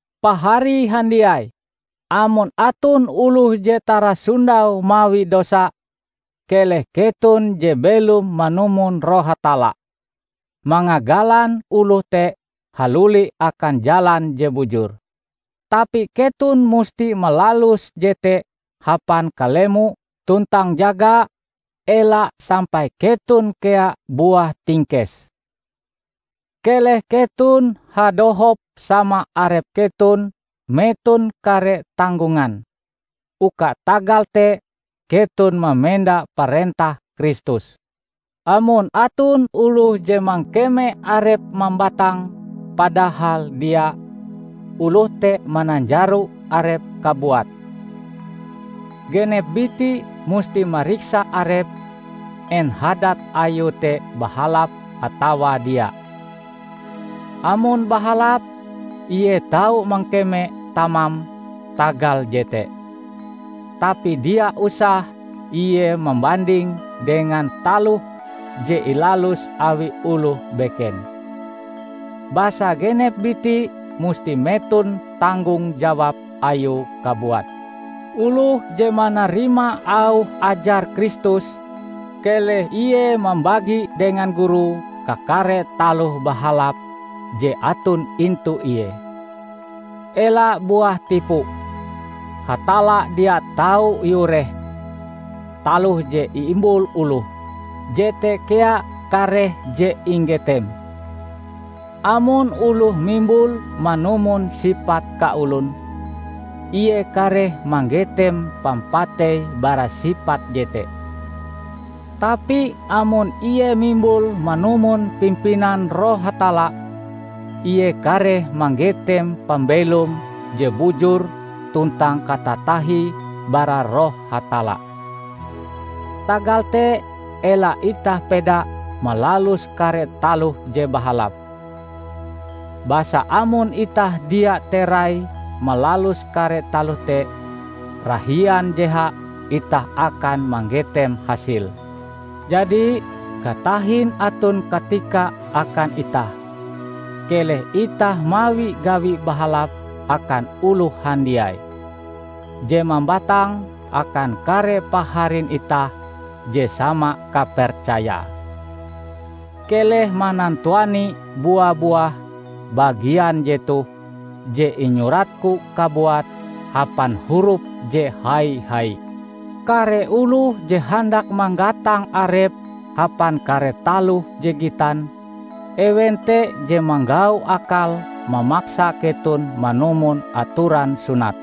Pahari handiai! Amon aton oloh je tarasondau mawi dosa, keleh keton, je belom manumon Roh Hatalla, mangagalan oloh te haluli akan jalan je bujur. Tapi keton musti malalus jete hapan kalemo tuntang jaga ela sampai keton kea buah tingkes. Keleh keton hadohop sama arep keton meton kare tanggongan, uka tagal te keton mamenda parentah Kristus. Amon aton oloh je mangkeme arepe mambatang, padahal dia, oloh te mananjaro arepe kabuat. Genep biti musti mariksa arepe en hadat ayue te bahalap atawa dia. Amon bahalap, ie tau mangkeme tamam tagal jete. Tapi dia usah ie mambandinge dengan taloh je ilalus awi oloh beken. Basa genep biti musti meton tanggung jawab ayue kabuat. Oloh je manarima auh ajar Kristus, keleh ie mambagi dengan gurue kakare taloh bahalap je aton intu ie. Ela buah tipu. Hatalla dia tau iureh! Taloh je iimbul oloh, jete kea kareh je inggeteme. Amon oloh mimbul manumon sipat kaolon, ie kareh manggetem pampatei bara sipat jete. Tapi amon ie mimbul manumon pimpinan Roh Hatalla, ie kareh manggetem pambelom je bujur tuntang katatahie bara Roh Hatalla. Tagal te ela itah peda malalus kare taloh je bahalap; basa amon itah dia terai malalus kare taloh te, rahian jeha itah akan manggetem hasile. Jadi, katahin aton katika akan itah, keleh itah mawi gawi bahalap akan oloh handiai, je mambatang akan kare paharin itah je sama kapercayae. Keleh manantuani bua-buah bagian jetoh je inyuratku kabuat hapan hurup je hai-hai. Kare oloh je handak manggatang arepe hapan kare taloh je gitan, ewen te je manggau akal mamaksa keton manumon atoran sunat.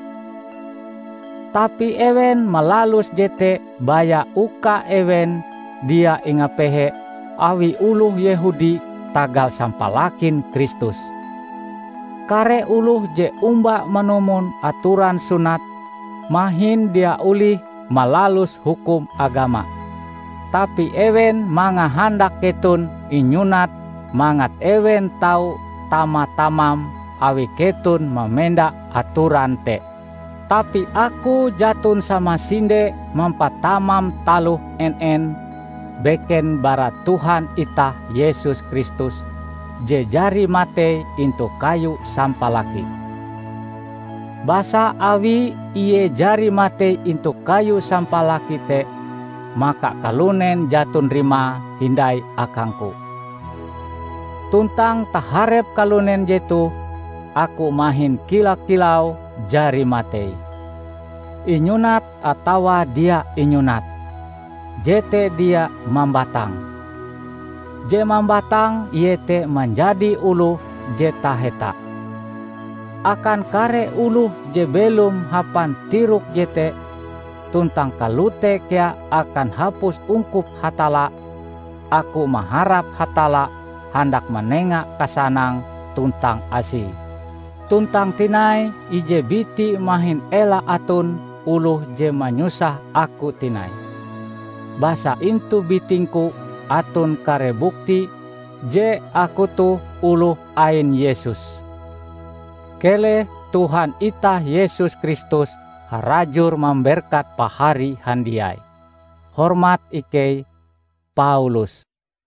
Tapi ewen malalus jete baya uka ewen dia ingapehe awi oloh Yehudi tagal sampalakin Kristus. Kare oloh je omba manumon atoran sunat mahin dia olihe malalus hukum agama. Tapi ewen mangahandak keton inyunat mangat ewen tau tama-tamam awi keton mamenda atoran te. Tapi aku jaton samasinde mampatamam taloh en-en, beken bara Tuhan itah Yesus Kristus je jari matei intu kayu sampalaki. Basa awi Ie jari matei intu kayu samapalaki te, maka kalunen jaton rimae hindai akangku. Tuntang taharep kalunen jetoh, aku mahin kila-kilau jari matei. Inyunat atawa dia inyunat, jete dia mambatang. Je mambatang iete manjadi oloh je taheta. Akan kare oloh je belom hapan tirok jete, tuntang kalote kea akan hapus ungkup Hatalla, aku maharap Hatalla handak manenga kasanang tuntang Asie. Tuntang tinai, ije biti mahin ela aton oloh je manyusah aku tinai, basa intu bitingku aton kare bukti je aku toh oloh ain Yesus. Keleh Tuhan itah Yesus Kristus harajur mamberkat pahari handiai. Hormat ikei, Paulus